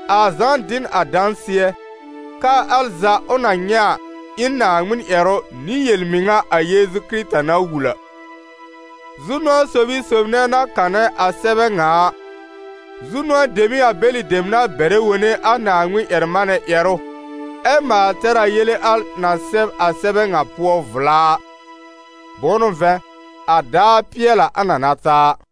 A Zã dɩ n a dãsɩɛ, k'aa al za ʋ na nyɛ̃ a, ɩ n Naaŋmɩn ƴɛrʋ nɩ yel-mɩŋa a Yeezu Kɩrɩta na wul a. Zu-nʋ̃ɔ sob ɩ sob nɛ̃ na kanɛ a sɛbɛ ŋa a, zu-nʋ̃ɔ dem n'ɩ a bɛlɩ dem na bɛrɛ wone a Naaŋmɩn-ƴɛr-manɛ ƴɛrʋ, ɛ maal tɛr a yele al na sɛb a sɛbɛ ŋa pʋɔ a vla a! Bʋ̃ʋ n'ʋ vɛ̃, a daar pɩɛl a, a na na ta a.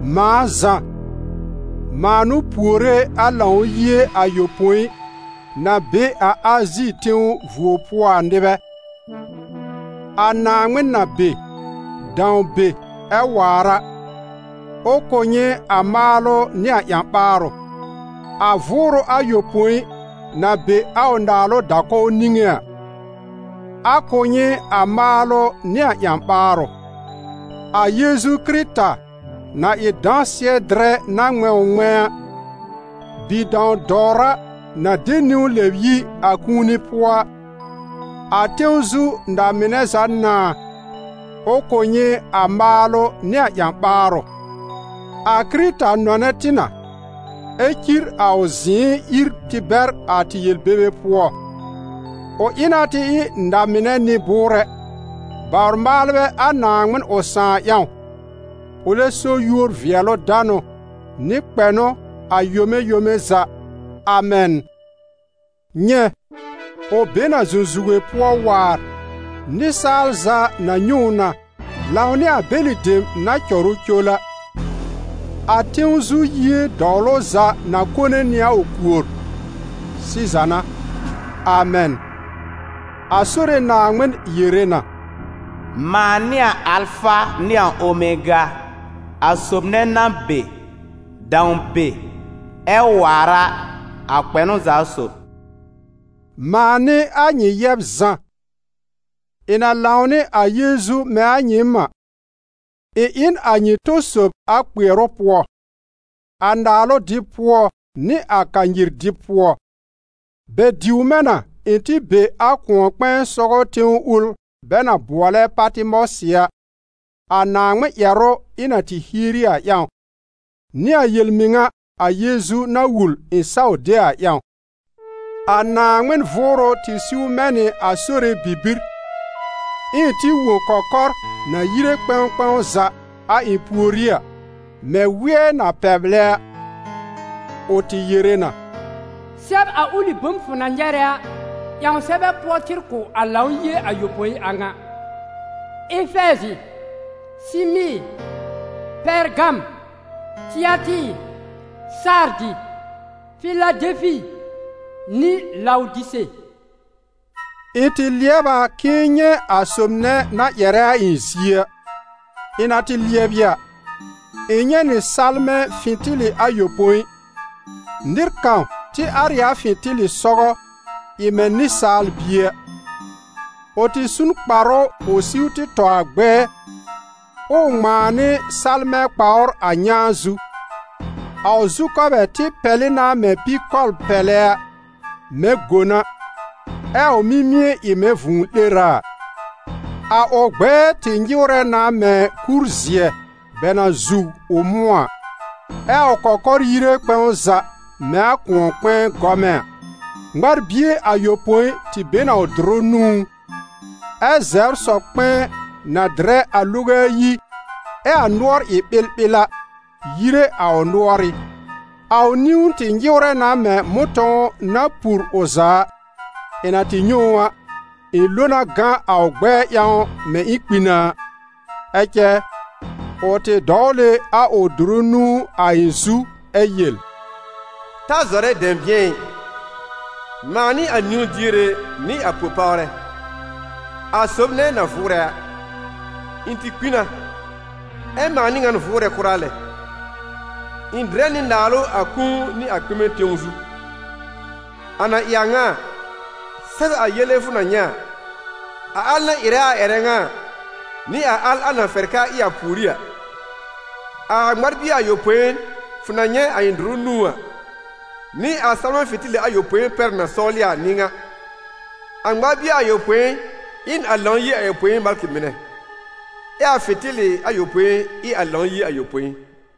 Mãa Zã, mãa n'ʋ puore a Lãw-yie ayopõi na be a Azi tẽw vuo pʋɔ a nɩbɛ: a Naaŋmɩn na be, dãw be ɛ waar a, ʋ kʋ̀ nyɩ a maalʋ nɩ a ƴã-ɓaarʋ; a Vʋʋrʋ ayopõi na be a ʋ naalʋ da-kɔw niŋé a, a kʋ̀ nyɩ a maalʋ nɩ a ƴã-ɓaarʋ; a Yeezu Kɩrɩta na ɩ dãsɩɛ-dɩrɛ na ŋmɛ̃ ʋ ŋmɛ̃a a, Bi-dãw-dɔwra na de niwn lɛb yi a kũuni pʋɔ a, a tẽw zu na-mɩnɛ za nãà, ʋ kʋ̀ nyɩ a maalʋ nɩ a ƴã-ɓaarʋ. A Kɩrɩta nɔnɛ tɩ na, ɛ́ cir a ʋ zɩ̃ɩ ír tɩ bɛr a tɩ yel-bebe pʋɔ. Ʋ ɩ na tɩ ɩ na-mɩnɛ nɩ-bʋʋrɛ, bawr-maalbɛ a Naaŋmɩn ʋ Sãà ƴãw, ʋlɛ so yúor-vɩɛlʋ-danʋ, nɩ kpɛnʋ a yome yome za. Amɛn. Nyɛ̃, ʋ be n a zũzuge pʋɔ waar, nɩsaal za na nyɛ̃ ʋ na, lãwnɩ a bɛlɩ dem na cɔr ʋ col a. A tẽw zu yie dɔwlʋ za na kone nɩ a ʋ kuor. Siza n'a. Amɛn. A Sore Naaŋmɩn yere na: «Mãa n'ɩ a Alfa nɩ a Omega, a sob nɛ na be, dãw be, ɛ waar a, a Kpɛnʋ za sob.» Mãa n'ɩ a nyɩ yɛb Zã; ɩ̃ na lãw nɩ a Yeezu mɛ̃ a nyɩɩm a, ɩ̃ ɩ n a nyɩ tɔ sob a kpɩɛrʋ pʋɔ, a naalʋ dɩb pʋɔ nɩ a kanyir dɩb pʋɔ. Bɛ diw mɛ̃ na ɩ̃ tɩ be a kʋ̃ɔ-kpɛ̃ɛ sɔgɔ tẽw ʋl bɛ na bʋɔlɛ Patɩmɔsɩ a, a Naaŋmɩn ƴɛrʋ ɩ̃ na tɩ hieri a ƴãw, nɩ a yel-mɩŋa a Yeezu na wul ɩ̃ saw de a ƴãw. A Naaŋmɩn Vʋʋrʋ tɩ siw mɛ̃ nɩ a Sore bibir, ɛ ɩ̃ tɩ wõ kɔkɔr na yire kpɛ̃w kpɛ̃w za a ɩ̃ pùorí a, mɛ̃ wɩɛ́ na pɛblɛ a; ʋ tɩ yere na: «Sɛb a ʋlɩ bom fʋ na nyɛrɛ a ƴãw sɛbɛ pʋɔ tɩr kʋ̀ a Lãw-yie ayopõi a ŋa: Efɛɛzɩ, Sɩmɩɩr, Pɛrgam, Tɩatɩɩr, Sardɩ, Fɩladɛlfɩ nɩ Lawdise.» Ɩ̃ tɩ lɩɛb a k'ɩ̃ɩ nyɛ̃ a sob nɛ na ƴɛrɛ a ɩ̃ zie a. Ɩ̃ na tɩ lɩɛbɩ a, ɩ̃ nyɛ̃ nɩ salmɛ̃ fɩ̃tɩlɩ ayopõi. Nɩr kãw tɩ ar ɩ a fɩ̃tɩlɩ sɔgɔ, ɩ mɛ̃ nɩsaal-bie a. Ʋ tɩ su n kparʋ ʋ siw tɩ tɔ a gbɛɛ, ɛ ʋ ŋmãa nɩ salmɛ̃ kpawr a nyãa zu. A ʋ zu-kɔbɛ tɩ pɛlɩ na mɛ̃ pikɔbl-pɛlɛ a, mɛ̃ gon a, ɛ a ʋ mimie ɩ mɛ̃ vũu-'lera a; a ʋ gbɛɛ tɩ nyɩwrɛ na mɛ̃ kur-zɩɛ bɛ na zuw ʋ mʋ̃ɔ a, ɛ a ʋ kɔkɔr yire kpɛ̃w za mɛ̃ a kʋ̃ɔ-kpɛ̃ɛ gɔmɛ a. Ŋmar-bie ayopõi tɩ be n a ʋ dʋrʋ nũú, ɛ́ zɛbr sɔ-kpɛ̃ɛ na dɩrɛ a loge ayi ɛ a nʋɔr ɩ ɓɩlɓɩl a, yire a ʋ nʋɔrɩ́. A ʋ niwn tɩ nyɩwrɛ na mɛ̃ mʋ̃tɔ̃w na pur ʋ za a. Ɩ̃ na tɩ nyɛ̃ ʋ a, ɩ̃ lo na gã a ʋ gbɛɛ ƴãw mɛ̃ ɩ̃ kpi na a. Ɛ cɛ, ʋ tɩ dɔwl ɩ a ʋ dʋrʋ nũu a ɩ̃ zu ɛ yel: «Ta zɔrɛ dɛ̃bɩ̃ɛ ɩ: mãa n'ɩ a niwn-diere nɩ a po-pawrɛ, a sob nɛ na vʋʋrɛ a. Ɩ̃ tɩ kpi na, ɛ mãa n'ɩ ŋan vʋʋrɛ kʋra lɛ. Ɩ̃ dɩrɛ nɩ naalʋ a kũu nɩ a kpɩmɛ tẽw zu. A na ɩ a ŋa a, sɛb a yele fʋ na nyɛ̃ a, a al na ɩrɛ a ƴɛrɛ ŋa a, nɩ a al a na fɛr k'aa ɩ a pùorí a. A ŋmar-bie ayopõi, fʋ na nyɛ̃ a ɩ̃ dʋrʋ nũú a, nɩ a salmɛ̃ fɩ̃tɩlɩ ayopõi pɛr na sɔwlɩ a n'ɩ ŋa: a ŋmar-bie ayopõi ɩ n a Lãw-yie ayopõi malkɩ mɩnɛ, ɛ a fɩ̃tɩlɩ ayopõi ɩ a Lãw-yie ayopõi.»